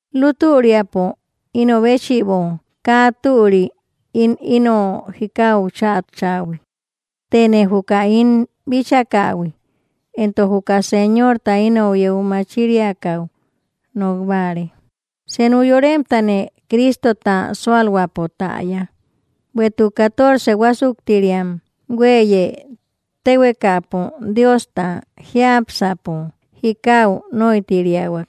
Lutüriapo ino béchïbo kaa türi ín ino jikau chatchähui, tëne juka ín bíchakähui entok juka Señorta inou yeu machiriakaü nokbare. Senu yoremtane Cristota sualhuäpo täya, bueïtuk catorce huasuktiriam hueíye tehuekapo Diosta jiápsäpo jikau nóitiriahuak.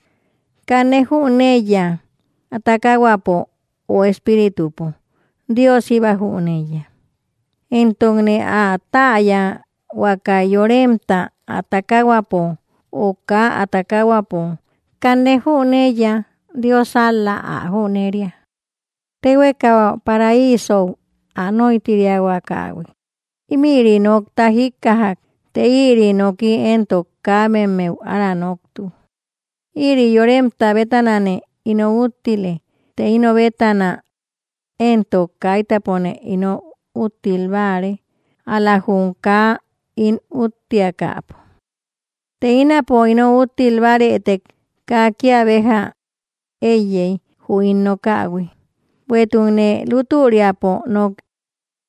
Kanne jüneiya ä takahuäpo ö espíritupo; Dios jíba jüneiya. Entokne ä täya huakai yoremta, ä takahuäpo ö kaa ä takahuäpo, kanne jüneiya, Dios ál‑la ä jünería. Tehueka paraisou ä nóitiriahuakahui, ímïri nokta jikkajak të ïri nooki entok kabemmeu ára noktu. Ïri yoremta bétanane ino úttile, të ino bétana entok kaitäpone ino úttil báare, ál‑la jum kaa ín úttiakäpo. Të ínapo ino úttil báarëtek kaa kia béja eíyey jü ín nokähui, bueïtukne lutüriapo nook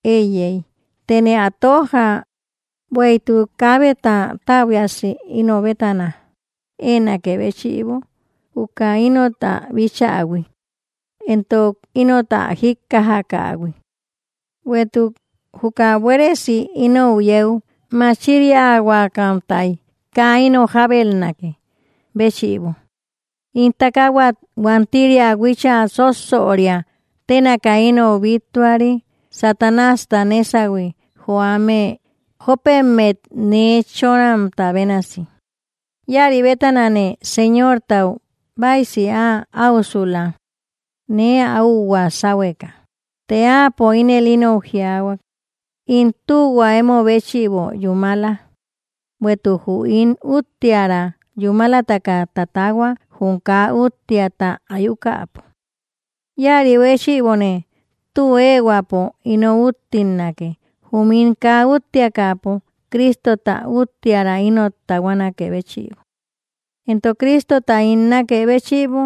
eíyey, tëne ä tojja bueïtuk kaabeta täbuiasi ino bétana eenakë béchïbo juka inot ä bichähui entok inot ä jikkajakähui. Bueïtuk juka buéresi inou yeu machiriahuakamtay, kaa ino jabelnakë béchïbo, ín takahuat huantiria huicha sósoria tenaka inou bittuari, Satanásta nesahui joame jopemmet nee chonamta bénasi. Ïari bétanane Señortau baysi ä aüsula nee ä úhua sahueka. Të áapo ínel inou jiaahuak: “In tühua emobéchïbo yúmala; bueïtuk jü ín uttiära yúmalataka tatahua jum kaa úttiata ayukäpo.” Ïaribéchïbone tü eehuäpo ino úttilnake, jum ín kaa úttiakäpo Cristota uttiära inot tahuanakë béchïbo. Entok Cristota ín nakë béchïbo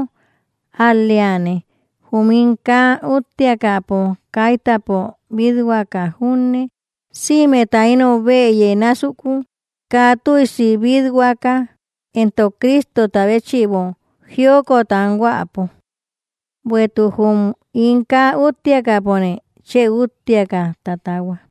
ál‑leane jum ín kaa úttiakäpo, kaitäpo bit-huaka junne, sïmeta inou bëye násuku, kaa tüisi bit-huaka, entok Cristota béchïbo jiokot anhuäpo. Bueïtuk jum ín kaa úttiakäpone, chë úttiaka tatahua.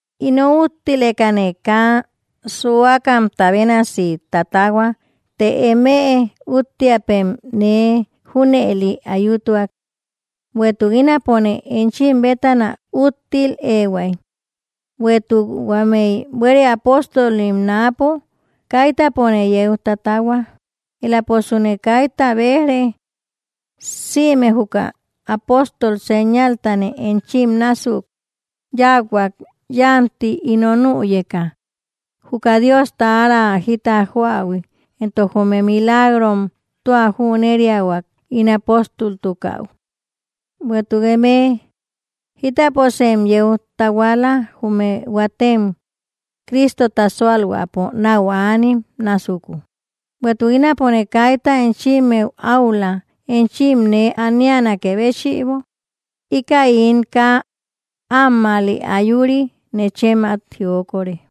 Ino úttilekane kaa suakamta bénasi tatahua, të emëe úttiapem nee junëli ayutuak. Bueïtuk ínapone enchim bétana úttil eehuay; bueïtuk huámeï buere apóstolim náapo kaitäpone yeu tatahua, eläposune kayta bejre. Sïme juka apóstol señaltane enchim násuk yauhuak yanti ino nüyeka, juka Diosta ára jita joähui entok jume milagrom, tua jüneriahuak ín apóstoltukähui. Bueïtuk emëe jitäposem yeu tahuala jume huatem Cristota sualhuäpo nau anim násuku, bueïtuk ínapone kayta enchimmeu áula enchim nee anianakë béchïbo, ¡íkäi ín kaa ammäli ayuri, nechem at jiokore!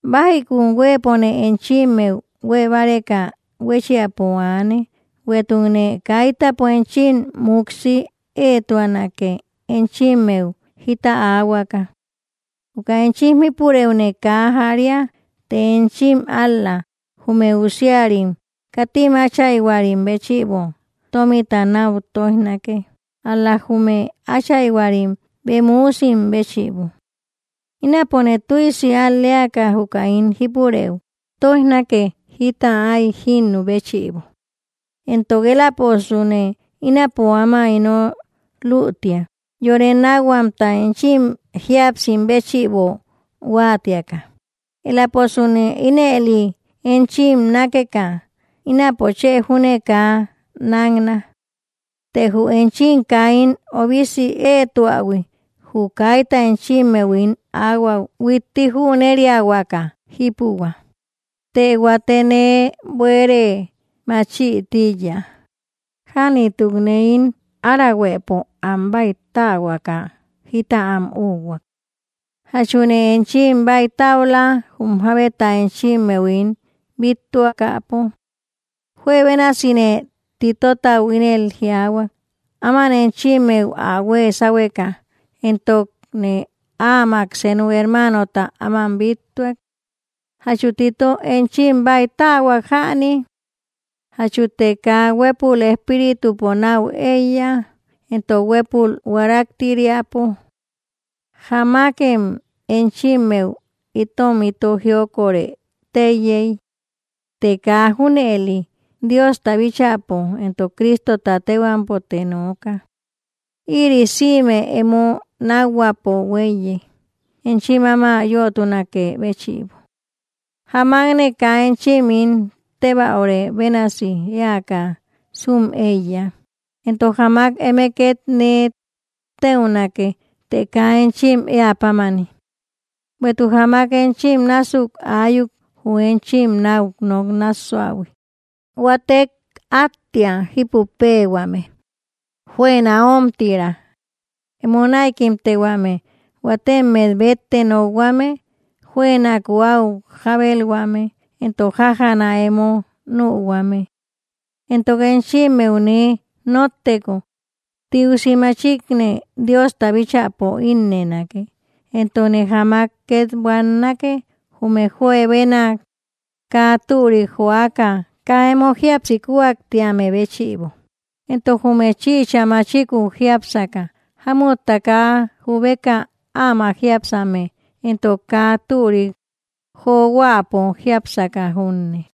Bajikun huëpone enchimmeu huebáreka huéchiapo aane, bueïtukne kaitäpo enchim muksi eetuanake enchimmeu jita aahuaka. Juka enchim jípurëune kaa jaria, të enchim ál‑la, jume usiarim katim áchayhuarim béchïbo tomita nau toijnake, ál‑la jume áchayhuarim bem üusim béchïbo. Ínapone tüisi al‑leaka juka ín jipurëu toijnake jita ái jinnü béchïbo, entok eläposune ínapo áma ino lütia yore nakhuamta enchim jíapsim béchïbo huatiaka, eläposune ínëli enchim nákeka, ínapo chë júne kaa nakna. Të jü enchim kaa ín obisi eetuähui, jü kayta enchimmeu ín ahuaü huitti jüneriahuaka jipuhuä, të huate nee buere machï tíiya jänitukne ín arahuëpo am báitähuaka jita am úkhuak. ¿Jachune enchim baïtaula jum jabeta enchimmeu ín bíttuakäpo? Juebénasine Titotau ínel jiaahuak, áman enchimmeu ä hue sahueka entokne áamak senu hermanota áman bíttuak. ¿Jachu Tito enchim báitähuak jäni? ¿Jachute kaa huepul espíritupo nau eiya, entok huepul huaraktiriapo? Jámakem enchimmeu itom ito jiokorë teíyey. Të kaa junëli; Diosta bíchäpo entok Cristota tehuampote nooka. Ïri sïme emo nakhuäpo hueíye, enchim áma yötunakë béchïbo. Jámakne kaa enchim ín teubarë bénasi eäka sum eíya, entok jámak eme ket nee teunake të kaa enchim eä pámani. Bueïtuk jámak enchim násuk ayuk jü enchim nau nok nassuähui, huatek attia jípupeehuame, juëna omtira, emo näikimtehuame, huatemet bettek nokhuame, juënaku au jabelhuame entok jájana emo nühuame. Entok enchimmeu nee notteko, tiusi machikne Diosta bíchäpo innënake, entokne jáamak ket buannake, jume juebenak kaa türik joaka kaa emo jíapsi kuaktiamë béchïbo entok jume chïcha machiku jiápsaka, jámutta kaa jubeka ámak jiápsame, entok kaa turik johuäpo jiápsaka junne.